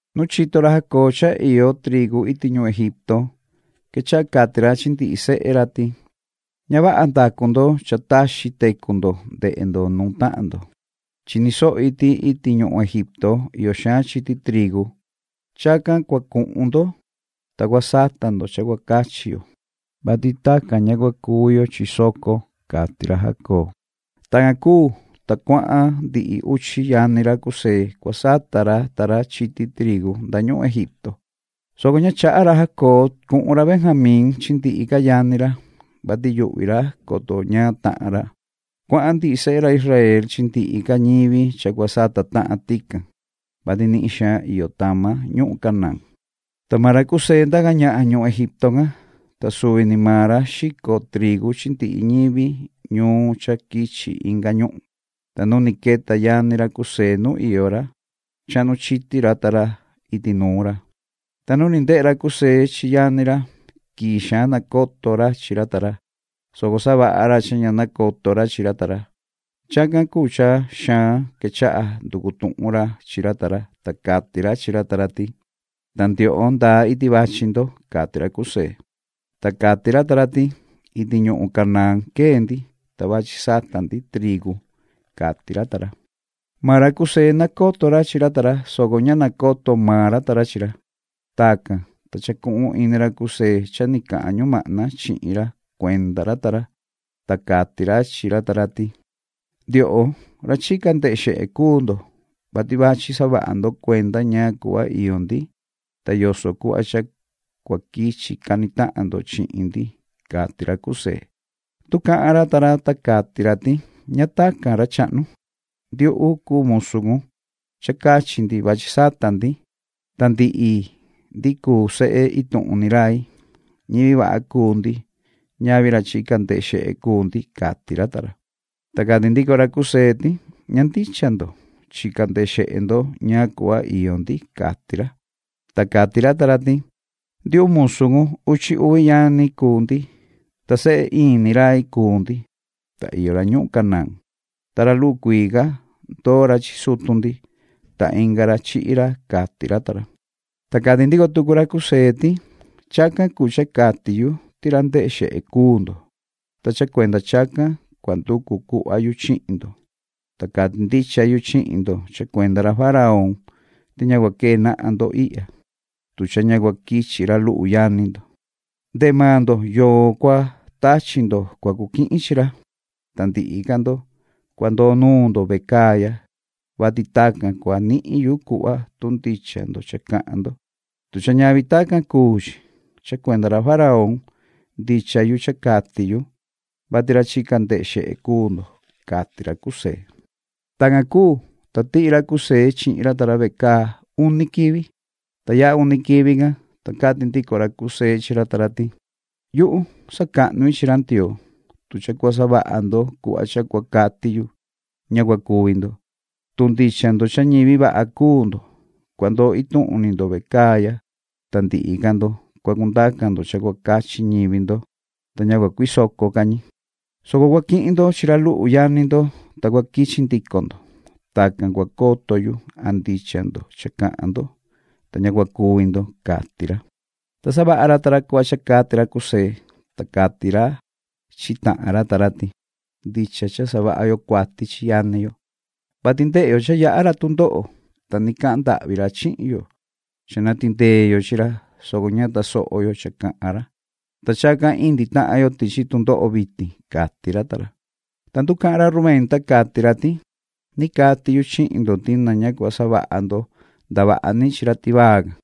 Nu chito ra Jacob cha iyo trigu iti ñuhun Egipto, quechaha cati ra chi ndihi sehe ra ti: “Ña vaha ndacu ndo cha taxi tecu ndo ndehe ndo nuun tahan ndo. Chini sohi ti iti ñuhun Egipto iyo xaan chiti trigu. Chacan cua cuhun ndo, ta cua sata ndo cha cua cachi yo, vati tacan ña cua cuvi yo chi soco”, cati ra Jacob. Tacan cuu, ta cuahan ndihi uchi yani ra José cua sata ra ta ra chiti trigu nda ñuhun Egipto, soco ña chaha ra Jacob cuhun ra Benjamín chi ndihi ca yani ra, vati yuhvi ra, coto ñaan tahan ra. Cuahan ndihi sehe ra Israel chi ndihi ca ñivi cha cua sata tahan tican, vati nihin xaan iyo tama ñuhun Canaán. Ta maan ra José ndaca ñahan ñuhun Egipto can, ta suvi ni maan ra xico trigu chi ndihi ñivi ñuun cha quichi inga ñuhun, ta nu ni queta yani ra José nu iyo ra, chahnu chiti ra ta ra iti nuun ra. Ta nu ni ndehe ra José chi yani ra, quii xaan nacoto ra chi ra ta ra, soco savaha ra cha ña nacoto ra chi ra ta ra. Chacan cuu cha xaan quechaha nducu tuhun ra chi ra ta ra, ta cati ra chi ra ta ra ti: ―¿Ta ndioho, ndaa iti vachi ndo? ―cati ra José. Ta cati ra ta ra ti: ―Iti ñuhun Canaán quee ndi, ta vachi sata ndi trigu ―cati ra ta ra. Maan ra José, nacoto ra chi ra ta ra, soco ña nacoto maan ra ta ra chi ra. Tacan, ta chacuhun ini ra José cha ni cahan ñumahna chihin ra cuenda ra ta ra, ta cati ra chi ra ta ra ti: ―Ndioho, ra chica ndehe xehe cuu ndo, vati vachi savaha ndo cuenda ñaan cuhva iyo ndi, ta yoso cuhva cha cua quichi cani tahan ndo chihin ndi ―cati ra José. Nducahan ra ta ra, ta cati ra ti: ―Ña tacan, ra chahnu. Ndiuhu cuu musu cun. Cha cachi ndi vachi sata ndi. Ta ndihi ndi cuu sehe ituhun ni rai. Ñivi vaha cuu ndi. Ñavi ra chica ndehe xehe cuu ndi ―cati ra ta ra. Ta cati ndico ra José ti: ―Ña ndicha ndo. Chica ndehe xehe ndo ñaan cuhva iyo ndi ―cati ra. Ta cati ra ta ra ti: ―Ndiuhu, musu cun. Uchi uvi yani cuu ndi, ta sehe in ni rai cuu ndi, ta iyo ra ñuhun Canaán. Ta ra luhu cuii ca, ndoo ra chi sutu ndi, ta inga ra, chihi ra ―cati ra ta ra. Ta cati ndico tucu ra José ti: ―Chacan cuu cha cati yu ti ra ndehe xehe cuu ndo. Ta cha cuenda chacan cua nducu cuhva yu chihin ndo, ta cati ndicha yu chihin ndo cha cuenda ra faraón ti ña cua quee nahan ndo ihya, tu cha ña cua quichi ra luhu yani ndo. Ndehe maan ndo yoo cua tachi ndo cua cu quihin chi ra, ta ndihi ca ndo, cua ndoo nuun ndo vecaa ya, vati tacan cua nihin yu cuhva tu ndicha ndo cha cahan ndo. Tu cha ñavi tacan cuu chi, cha cuenda ra faraón ndicha yu cha cati yu, vati ra chica ndehe xehe cuu ndo ―cati ra José. Tacan cuu, ta tihi ra José chihin ra ta ra vecaa uni quivi. Ta yaha uni quivi can, ta cati ndico ra José chi ra ta ra ti: ―Yuhu, sacahnu-i chi ra Ndioo. Tu cha cua savaha ndo cuhva cha cua cati yu, ña cua cuvi ndo. Tu ndicha ndo cha ñivi vaha cuu ndo, cua ndoo ituhun ni ndo vecaa ya, ta ndihi ca ndo, cua cundaca ndo cha cua cachi ñivi ndo, ta ña cua cuisoco ca ñi, soco cua quihin ndo chi ra luhu yani ndo, ta cua quichi ndico ndo. Tacan cua coto yuan ndicha ndo cha cahan ndo, ta ña cua cuvi ndo ―cati ra. Ta savaha ra ta ra cuhva cha cati ra José. Ta cati ra chi tahan ra ta ra ti: ―Ndicha cha savaha yo cuati chi yani yo, vati ndehe yo cha yaha ra tundoho, ta ni cahan ndahvi ra chihin yo cha na tindee yo chi ra, soco ña tasoho yo cha cahan ra, ta chacan indi tahan yo tichi tundoho vitin ―cati ra ta ra. Ta nducahan ra Rubén, ta cati ra ti: ―Cha cati yu chihin ndo ti na ña cua savaha ndo ndavaha ni chi ra tivaa can,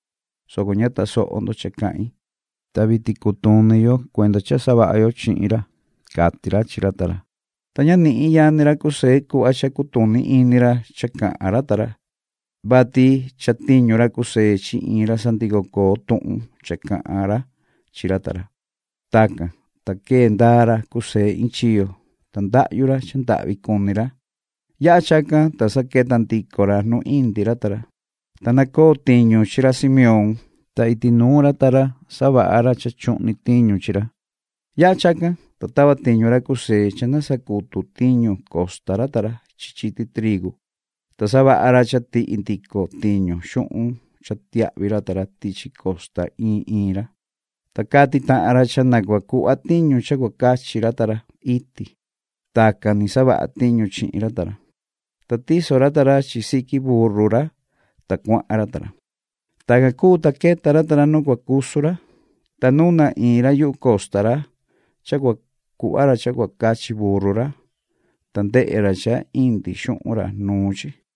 soco ña tosoho ndo cha cahin, ta vitin cutuni yo cuenda cha savaha yo chihin ra ―cati ra chi ra ta ra. Ta ña nihin yani ra José cuhva cha cutuni ini ra cha cahan ra ta ra, vati chatiñu ra José chi iin ra sandico coo tuhun cha cahan ra chi ra ta ra. Tacan, ta quee ndaa ra José iin chiyo, ta ndahyu ra cha ndahvi cuni ra. Yaha chacan, ta sa queta ndico ra nu indi ra ta ra, ta nacoo tiñu chi ra Simeón, ta iti nuun ra ta ra savaha ra cha chuhni tiñu chi ra. Yaha chacan, ta tava tiñu ra José cha na sacutu tiñu costa ra ta ra chi chiti trigu, ta savaha ra cha tihi ndico tiñu xuhun cha tiahvi ra ta ra tichi costa iin iin ra. Ta cati tahan ra cha na cua cuhva tiñu cha cua cachi ra ta ra iti. Tacan ni savaha tiñu chihin ra ta ra. Ta tiso ra ta ra chi siqui burru ra, ta cuahan ra ta ra. Tacan cuu, ta queta ra ta ra nu cua cusu ra, ta nuna iin ra yuhu costa ra cha cua cuhva ra cha cua cachi burru ra, ta ndehe ra cha indi xuhun ra nuun chi.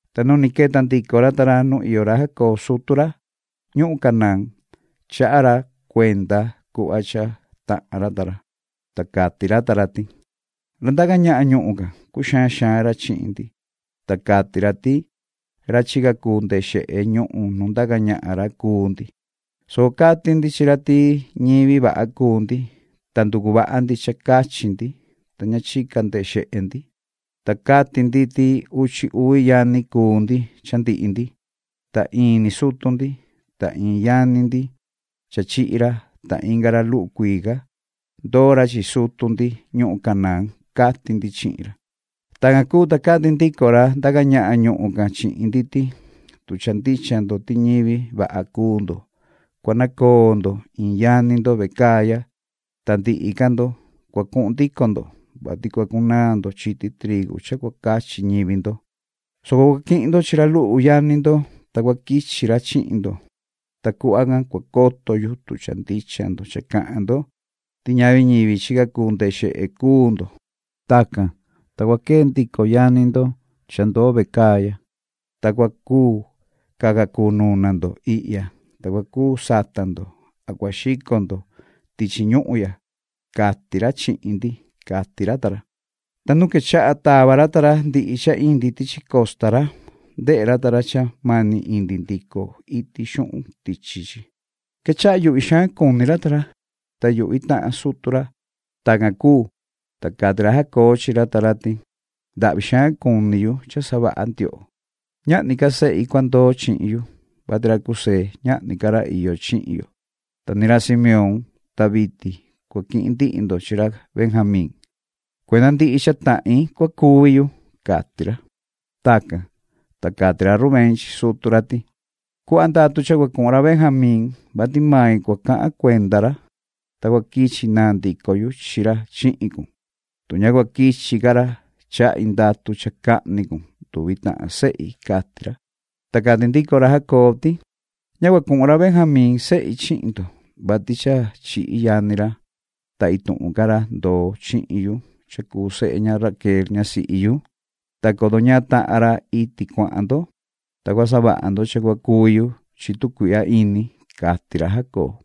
Ta nu ni queta ndico ra ta ra nu iyo ra Jacob sutu ra ñuhun Canaán, chaha ra cuenda cuhva cha tahan ra ta ra. Ta cati ra ta ra ti: ―Ra ndaca ñahan ñuhun can, cuxaan xaan ra chihin ndi, ta cati ra ti ra chica cuu ndehe xehe ñuhun nu ndaca ñahan ra cuu ndi, soco cati ndi chi ra ti ñivi vaha cuu ndi, ta nducu vaha ndi cha cachi ndi, ta ña chica ndehe xehe ndi. Ta cati ndi ti uchi uvi yani cuu ndi cha ndihi ndi, ta in ni sutu ndi, ta iin yani ndi cha chihi ra, ta inga ra luhu cuii ca, ndoo ra chi sutu ndi ñuhun Canaán ―cati ndi chihin ra. Tacan cuu, ta cati ndico ra ndaca ñahan ñuhun can chihin ndi ti: ‘Tu cha ndicha ndo ti ñivi vaha cuu ndo, cua nacoo ndo iin yani ndo vecaa ya, ta ndihi ca ndo, cua cuhun ndico ndo, vati cua cunaan ndo chiti trigu cha cua cachi ñivi ndo, soco cua quihin ndo chi ra luhu yani ndo ta cua quichi ra chihin ndo, ta cuhva can cua coto yu tu cha ndicha ndo cha cahan ndo ti ñavi ñivi chica cuu ndehe xehe cuu ndo. Tacan, ta cua quee ndico yani ndo cha ndoo vecaa ya, ta cua cuu caca cuu nuna ndo ihya, ta cua cuu sata ndoan cua xico ndo tichi ñuhun ya’, cati ra chihin ndi. Ta nu quechaha tava ra ta ra ndihi cha indi tichi costa, ndehe ra ta ra cha mani indi ndico iti xuhun tichi chi, ta quechaha yuhvi xaan cuni ra ta ra, ta yuhvi tahan sutu ra. Tacan cuu, ta cati ra Jacob chi ra ta ra ti: ―¡Ndahvi xaan cuni yu cha savaha ndioho! Ñahni ca sehi cua ndoo chihin yu, vati ra José, ñahni ca ra iyo chihin yo, ta ni ra Simeón. Ta vitin cua quihin ndo chi ra Benjamín. ¡Cuenda ndihi cha tahin cua cuvi yu! ―cati ra. Tacan, ta cati ra Rubén chi sutu ra ti: ―Cuhva ndatu cha cua cuhun ra Benjamín, vati mai cua cahan cuenda ra, ta cua quichi naa ndico yu chi ra chihin cun. Tu ña cua quichi ca ra, chahi ndatu cha cahni cun nduvi tahan sehi ―cati ra. Ta cati ndico ra Jacob ti: ―Ña cua cuhun ra Benjamín sehi chihin ndo, vati cha chihi yani ra, ta ituhun ca ra ndoo chihin yu cha cuu sehe ña Raquel ñasihi yu. Ta coto ñaan tahan ra iti cuahan ndo, ta cua savaha ndo cha cua cuvi yu chi tu cuihya ini ―cati ra Jacob.